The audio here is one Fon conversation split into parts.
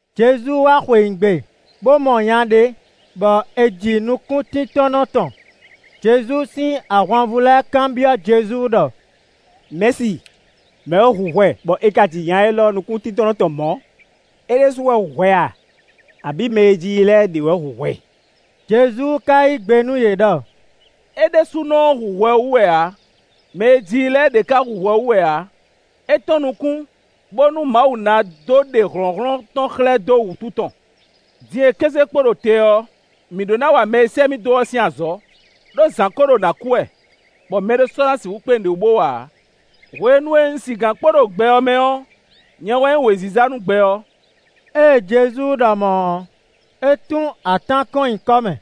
Jezu wá xweyǐgbe, bó mɔ nya ɖé, bɔ è ji nukúntíntɔ́nnɔ tɔn. Jezu sín ahwanvú lɛ́ɛ kanbyɔ́ Jezu ɖɔ: “Mɛ̌si, mɛ̌ wɛ hu hwɛ bɔ è ka ji nya élɔ́ nukúntíntɔ́nnɔ tɔn mɔ̌? É ɖésú wɛ hu hwɛ a, abǐ mɛ e ji i lɛ́ɛ ɖě wɛ hu hwɛ?” Jezu ka yí gbe nú yě ɖɔ: “É ɖésúnɔ ɔ́ hu hwɛ wú wɛ ǎ, mɛ e ji i lɛ́ɛ ɖě ká hu hwɛ wú wɛ ǎ; é tɔ́n nukún, bónú Mawu ná dó ɖe hlɔ̌nhlɔ́n tɔn xlɛ́ dó wǔtu tɔn. Din e kéze kpo ɖo te ɔ́, mǐ ɖó ná wa mɛ e sɛ́ mì dó ɔ́ sín azɔ̌, ɖó zǎn ko ɖo nǎ kú wɛ, bɔ mɛɖé sɔ́ ná sixú kpé nǔɖé wú bó wa ǎ. Hwenu e un sigǎn kpo ɖo gbɛ ɔ́ mɛ ɔ́, nyɛ wɛ nyí wěziza nú gbɛ ɔ́.” Ée Jezu ɖɔ mɔ̌ ɔ́, é tún atán kɔn nyi kɔ́ mɛ,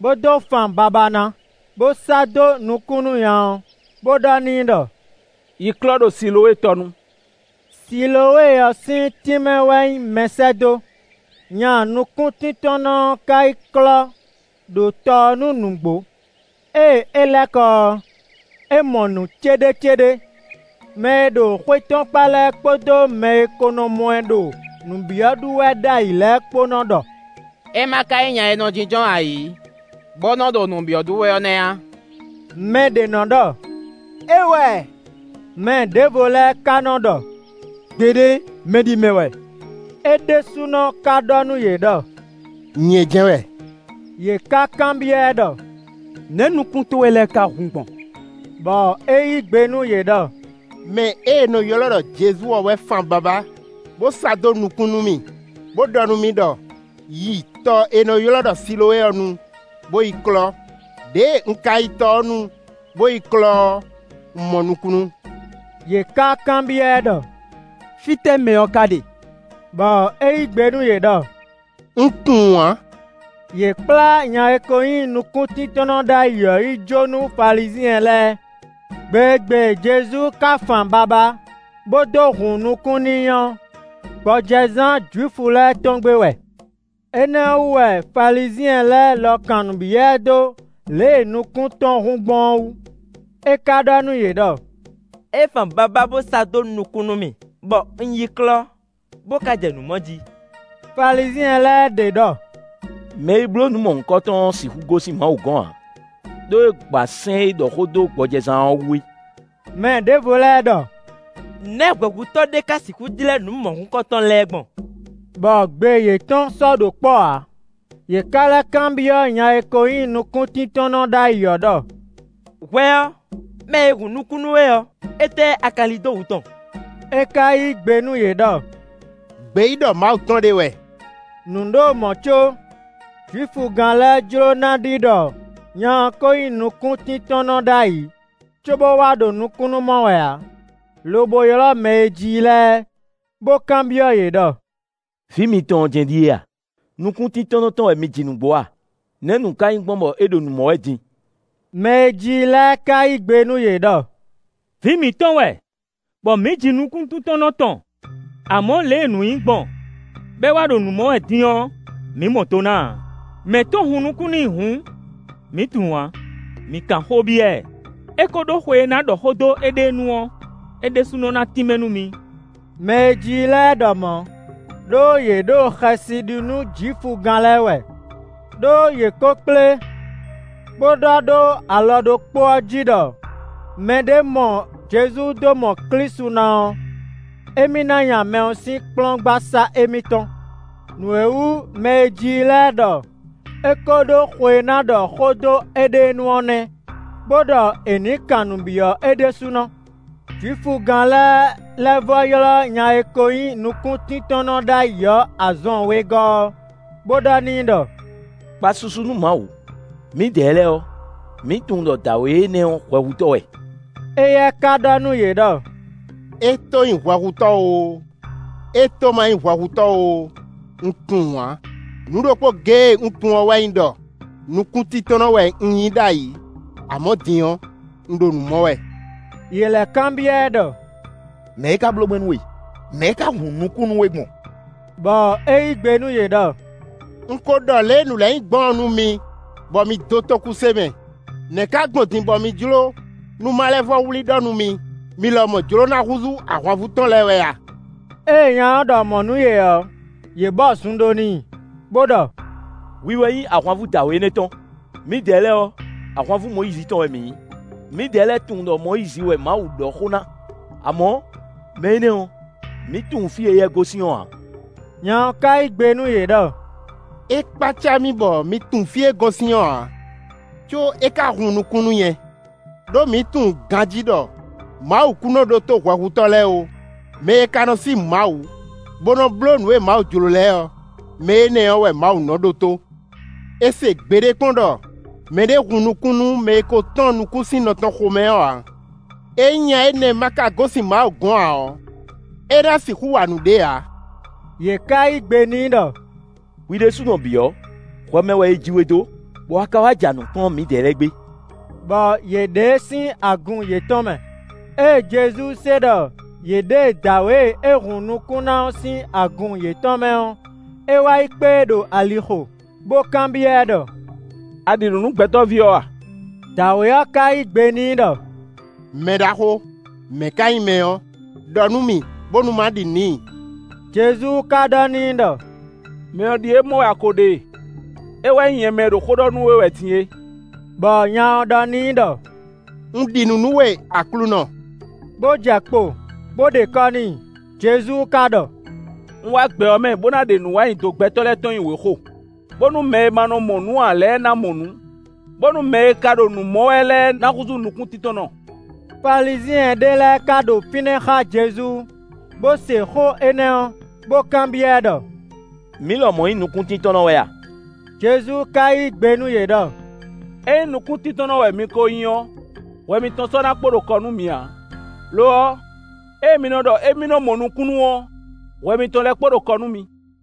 bó dó fan babá ná, bó sá dó nukún nú nya ɔ́, bo ɖɔ n'i ɖɔ: “Yi klɔ́ ɖo Silowée tɔnu.” (Silowée ɔ́ sín tínmɛ wɛ nyí mɛsɛ́dó.) Nya nukúntíntɔ́nnɔ ɔ́ ka yi klɔ́ ɖo tɔ ɔ́ nu nǔgbó; ée é lɛ́ kɔ ɔ́, é mɔ nǔ céɖécéɖé. Mɛ e ɖo xwé tɔn kpá lɛ́ɛ kpódó mɛ e ko nɔ mɔ ɛ ɖo nǔ byɔ́ ɖu wɛ ɖ'ayǐ lɛ́ɛ kpó nɔ ɖɔ: “É ma ka nyí nya e nɔ jínjɔ́n ayǐ, bo nɔ ɖo nǔ byɔ́ ɖu wɛ ɔ́ nɛ́ a?” Mɛɖě nɔ ɖɔ: “É wɛ”, mɛ ɖěvo lɛ́ɛ ka nɔ ɖɔ: “Gbeɖé, mɛɖimɛ wɛ.” É ɖésúnɔ ka ɖɔ nú yě ɖɔ: “Nyɛ jɛ́n wɛ.” Yě ká kanbyɔ́ ɛ ɖɔ: “Nɛ̌ nukún towe lɛ́ɛ ka hun gbɔn?” Bɔ é yí gbe nú yě ɖɔ: “Mɛ e è nɔ ylɔ́ ɖɔ Jezu ɔ́ wɛ fan babá, bó sá dó nukún nú mì, bó ɖɔ nú mì ɖɔ: ‘Yi tɔ e è nɔ ylɔ́ ɖɔ Silowée ɔ́ nu, bó yi klɔ́.’ Ɖěe un ka yi tɔ ɔ́ nu bó yi klɔ́ ɔ́, un mɔ nukúnnú.” Yě ká kanbyɔ́ ɛ ɖɔ: “Fítɛ́ mɛ ɔ́ ka ɖe?” Bɔ é yí gbe nú yě ɖɔ: “Un tunwun ǎ.” Yě kplá nya e ko nyí nukúntíntɔ́nnɔ ɖ'ayǐ ɔ́ yi jó nú Falizyɛn lɛ́ɛ. Gbe e gbe Jezu ka fan babá, bó dó hun nukún n'i ɔ́, gbɔjɛzán Jwifu lɛ́ɛ tɔn gbe wɛ. Énɛ́ ɔ́ wú wɛ Falizyɛn lɛ́ɛ lɔ kan nǔ byɔ́ ɛ dó lě e nukún tɔn hun gbɔn ɔ́ wú. É ka ɖɔ nú yě ɖɔ: “É fan babá bó sá dó nukún nú mì, bɔ un yi klɔ́, bó ka jɛ nǔ mɔ jí.” Falizyɛn lɛ́ɛ ɖě ɖɔ: “Mɛ e bló nǔ mɔ̌hunkɔ ɔ́ sixú gosín Mawu gɔ́n ǎ; ɖó é gba sɛ́n e ɖɔ xó dó gbɔjɛzán ɔ́ wú é.” Mɛ ɖěvo lɛ́ɛ ɖɔ: “Nɛ̌ hwɛhutɔ́ ɖé ka sixú jlɛ́ nǔ mɔ̌hunkɔtɔn lɛ́ɛ gbɔn?” Bɔ gbe yětɔn sɔ́ ɖo kpɔ́ ǎ. Yě ká lɛ́ kanbyɔ́ nya e ko nyí nukúntíntɔ́nnɔ ɖ'ayǐ ɔ́ ɖɔ: “Hwɛ ɔ́, mɛ e hun nukún nú we ɔ́, étɛ́ a ka lin dó wǔ tɔn?” É ka yí gbe nú yě ɖɔ: “Gbeyíɖɔ Mawu tɔn ɖé wɛ.” Nǔ ɖo mɔ̌ có Jwifugán lɛ́ɛ jló ná ɖi ɖɔ nya ɔ́ ko nyí nukúntíntɔ́nnɔ ɖ'ayǐ, cóbó wá ɖo nukúnnú mɔ wɛ ǎ, lobo ylɔ́ mɛ e ji i lɛ́ɛ, bó kanbyɔ́ yě ɖɔ: “Vǐ mitɔn ɔ́ jɛ́n ɖíe a? Nukúntíntɔ́nnɔ tɔn wɛ mi ji nǔgbó a? Nɛ̌ nǔ ka nyí gbɔn bɔ é ɖo nǔ mɔ wɛ din?” Mɛ e ji i lɛ́ɛ ka yí gbe nú yě ɖɔ: “Vǐ mǐtɔn wɛ, bɔ mǐ ji nukúntíntɔ́nnɔ tɔn. Amɔ̌, lě e nǔ nyí gbɔn, bɔ é wá ɖo nǔ mɔ wɛ din ɔ́, mǐ mɔ do ná ǎ; mɛ̌ to hun nukún n'i hǔn, mǐ tunwun ǎ. Mi kan xó byɔ́ ɛ, é ko ɖó xwe e ná ɖɔ xó dó éɖée nu ɔ́; é ɖésúnɔ ná tínmɛ nú mi.” Mɛ e ji i lɛ́ɛ ɖɔ mɔ̌, ɖó yě ɖo xɛsi ɖi nú Jwifugán lɛ́ɛ wɛ, ɖó yě ko kplé, bó ɖɔ ɖó alɔ ɖokpó ɔ́ jí ɖɔ mɛɖé mɔ Jezu dó mɔ Klísu ná ɔ́, émí ná nya mɛ ɔ́ sín kplɔ́ngbasá émítɔn. Nǔ e wú mɛ e ji i lɛ́ɛ ɖɔ é ko ɖó xwe e ná ɖɔ xó dó éɖée nu ɔ́ nɛ́, bó ɖɔ è nǐ kan nǔ byɔ́ é ɖésúnɔ. Jwifugán lɛ́ɛ lɛ́ vɔ́ ylɔ́ nya e ko nyí nukúntíntɔ́nnɔ ɖ'ayǐ ɔ́ azɔn wegɔ́ ɔ́, bó ɖɔ n'i ɖɔ: “Kpa susu nú Mawu; mǐdɛɛ lɛ́ɛ ɔ́, mǐ tunwun ɖɔ dǎwe énɛ́ ɔ́, hwɛhutɔ́ wɛ.” Éyɛ́ ka ɖɔ nú yě ɖɔ: “E to nyí hwɛhutɔ́ oo, é to ma nyí hwɛhutɔ́ oo, un tunwun ǎ; nǔ ɖokpó géé e un tunwun ɔ́ wɛ nyí ɖɔ: nukúntíntɔ́nnɔ wɛ un nyí ɖ'ayǐ; amɔ̌ din ɔ́, un ɖo nǔ mɔ wɛ.” Yě lɛ́ kanbyɔ́ ɛ ɖɔ: “Nɛ̌ é ká bló gbɔn nú we? Nɛ̌ é ká hun nukún nú we gbɔn?” Bɔ é yí gbe nú yě ɖɔ: “Un ko ɖɔ lě e nǔ lɛ́ɛ nyí gbɔn ɔ́ nú mi, bɔ mi dó tókúse mɛ; nɛ̌ ka gbɔn din bɔ mi jló nú ma lɛ́ vɔ́ wlí ɖɔ nú mì? Mi lɔmɔ̌ jló ná húzú ahwanvú tɔn lɛ́ɛ wɛ a?” Ée nya ɔ́ ɖɔ mɔ̌ nú yě ɔ́, yě bɔ zun ɖó n'i, bó ɖɔ: “Hwi wɛ nyí ahwanvú dǎwe énɛ́ tɔn, mǐdɛɛ lɛ́ɛ ɔ́, ahwanvú Mɔyízi tɔn wɛ mǐ nyí. Mǐdɛɛ lɛ́ɛ tunwun ɖɔ Mɔyízi wɛ Mawu ɖɔ xó ná; amɔ̌, mɛ énɛ́ ɔ́, mi tunwun fí e éyɛ́ gosín ɔ́ ǎ.” Nya ɔ́ ka yí gbe nú yě ɖɔ: “É kpácá mì bɔ mi tunwun fí e é gosín ɔ́ ǎ, có é ka hun nukún nú nyɛ. Đó mǐ tunwun ganjí ɖɔ Mawu kún nɔ ɖótó hwɛhutɔ́ lɛ́ɛ ó; mɛ e ka nɔ sí Mawu bo nɔ blǒ nǔ e Mawu jlǒ lɛ́ɛ ɔ́, mɛ énɛ́ ɔ́ wɛ Mawu nɔ ɖótó. È se gbeɖé kpɔ́n ɖɔ mɛɖé hun nukún nú mɛ e ko tɔ́n nukún sín nɔ tɔn xo mɛ ɔ́ ǎ. Ényí nya énɛ́ ma ka gosín Mawu gɔ́n ǎ ɔ́, é ná sixú wa nǔɖé ǎ.” Yě ká yí gbe n'i ɖɔ: “Hwi ɖésúnɔ bǐ ɔ́, hwɛ mɛ wɛ è ji we dó, bɔ a ka wá ja nǔ kplɔ́n mǐdɛɛ lɛ́ɛ gbé.” Bɔ yě ɖe e sín agun yětɔn mɛ. Ée Jezu se ɖɔ yě ɖe dǎwe e é hun nukún ná ɔ́ sín agun yětɔn mɛ ɔ́, é wá yi kpé e ɖo alixo, bó kanbyɔ́ ɛ ɖɔ: “A ɖi nǔ nú Gbɛtɔ́ví ɔ́ a?” Dǎwe ɔ́ ka yí gbe n'i ɖɔ: “Mɛɖaxó, mɛ̌ ka nyí mɛ ɔ́, ɖɔ nú mì bónú má ɖi nǔ n'i.” Jezu ka ɖɔ n'i ɖɔ: “Mɛ ɔ́ ɖíe mɔ wɛ a ko ɖe e; é wɛ nyí nyɛ mɛ e ɖo xó ɖɔ nú we wɛ din é.” Bɔ nya ɔ́ ɖɔ n'i ɖɔ: “Un ɖi nǔ nú we, Aklúnɔ,” bó jɛ kpo, bó ɖe kɔ́ n'i. Jezu ka ɖɔ: “Un wá gbɛ ɔ́ mɛ bó ná ɖe nǔwanyido gbɛtɔ́ lɛ́ɛ tɔn nyi wěxo, bónú mɛ e ma mɔ nǔ ǎ lɛ́ɛ ná mɔ nǔ, bónú mɛ e ka ɖo nǔ mɔ wɛ lɛ́ɛ ná húzú nukúntíntɔ́nnɔ.” Falizyɛn ɖé lɛ́ɛ ka ɖo fínɛ́ xá Jezu, bó se xó énɛ́ ɔ́, bó kanbyɔ́ ɛ ɖɔ: “Mǐ lɔmɔ̌ nyí nukúntíntɔ́nnɔ wɛ a?” Jezu ka yí gbe nú yě ɖɔ: “Ényí nukúntíntɔ́nnɔ wɛ mi ko nyí ɔ́, hwɛ mitɔn sɔ́ ná kpo ɖo kɔ nú mi ǎ. Lo ɔ́, ée mi nɔ ɖɔ émí nɔ mɔ nukúnnú ɔ́, hwɛ mitɔn lɛ́ɛ kpo ɖo kɔ nú mi.”